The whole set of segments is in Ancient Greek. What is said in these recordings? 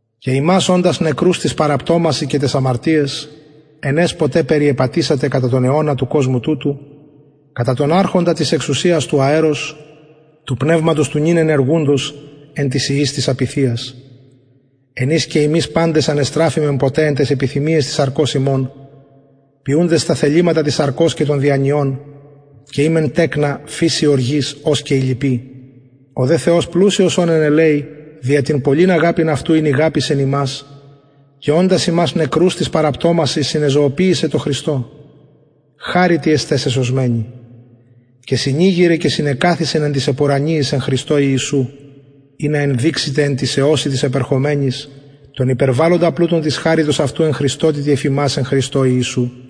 και υμας οντας νεκρους τοις παραπτωμασιν και ταις αμαρτιαις εν αις ποτε περιεπατησατε κατα τον αιωνα του κοσμου τουτου κατα τον αρχοντα της εξουσιας του αερος του πνευματος του νυν ενεργουντος εν τοις υιοις της απειθειας εν οις και ημεις παντες ανεστραφημεν ποτε εν ταις επιθυμιαις της σαρκος ημων ποιουντες τα θεληματα της σαρκος και των διανοιων και ημεν τεκνα φυσει οργης ως και οι λοιποι ο δε θεος πλουσιος ων εν ελεει δια την πολλην αγαπην αυτου ην ηγαπησεν ημας και οντας ημας νεκρους τοις παραπτωμασιν συνεζωοποιησεν τω χριστω χαριτι εστε σεσωσμενοι και συνηγειρεν και συνεκαθισεν εν τοις επουρανιοις εν χριστω ιησου ινα ενδειξηται εν τοις αιωσιν τοις επερχομενοις τον υπερβαλλοντα πλουτον της χαριτος αυτου εν χρηστοτητι εφ ημας εν χριστω ιησου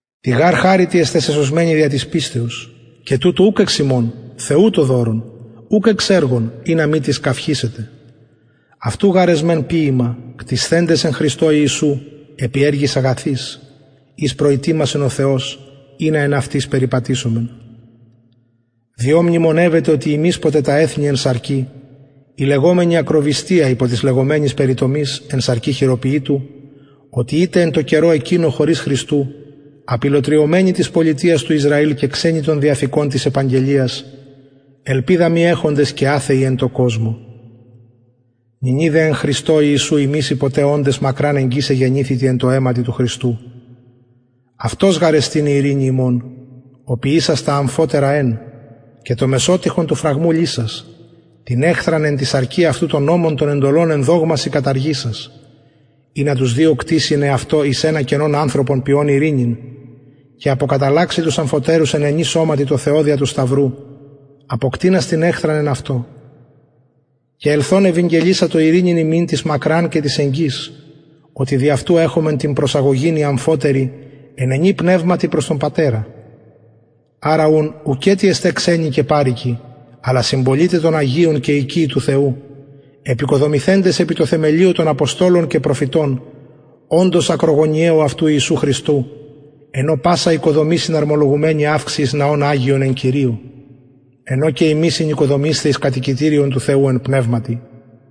τη γαρ χαριτι εστε σεσωσμενοι δια της πιστεως και τουτο ουκ εξ υμων θεου το δωρον ουκ εξ εργων ινα μη τις καυχησηται αυτου γαρ εσμεν ποιημα κτισθεντες εν χριστω ιησου επι εργοις αγαθοις οις προητοιμασεν ο θεος ινα εν αυτοις περιπατησωμεν διο μνημονευετε οτι υμεις ποτε τα εθνη εν σαρκι οι λεγομενοι ακροβυστια υπο της λεγομενης περιτομης εν σαρκι χειροποιητου οτι ητε εν τω καιρω εκεινω χωρις χριστου απηλλοτριωμενοι της πολιτειας του ισραηλ και ξενοι των διαθηκων της επαγγελιας ελπιδα μη εχοντες και αθεοι εν τω κοσμω νυνι δε εν χριστω ιησου υμεις οι ποτε οντες μακραν εγγυς εγενηθητε εν τω αιματι του χριστου αυτος γαρ εστιν η ειρηνη ημων ο ποιησας τα αμφοτερα εν και το μεσοτοιχον του φραγμου λυσας την εχθραν εν τη σαρκι αυτου τον νομον των εντολων εν δογμασιν καταργησας ινα τους δυο κτιση εν εαυτω εις ενα καινον ανθρωπον ποιων ειρηνην και αποκαταλλαξη τους αμφοτερους εν ενι σωματι τω θεω δια του σταυρου αποκτεινας την εχθραν εν αυτω και ελθων ευηγγελισατο ειρηνην υμιν τοις μακραν και τοις εγγυς οτι δι αυτου εχομεν την προσαγωγην οι αμφοτεροι εν ενι πνευματι προς τον πατερα αρα ουν ουκετι εστε ξενοι και παροικοι αλλα συμπολιται των αγιων και οικειοι του θεου εποικοδομηθεντες επι τω θεμελιω των αποστολων και προφητων οντος ακρογωνιαιου αυτου ιησου χριστου εν ω πασα οικοδομη συναρμολογουμενη αυξει εις ναον αγιον εν κυριω εν ω και υμεις συνοικοδομεισθε εις κατοικητηριον του θεου εν πνευματι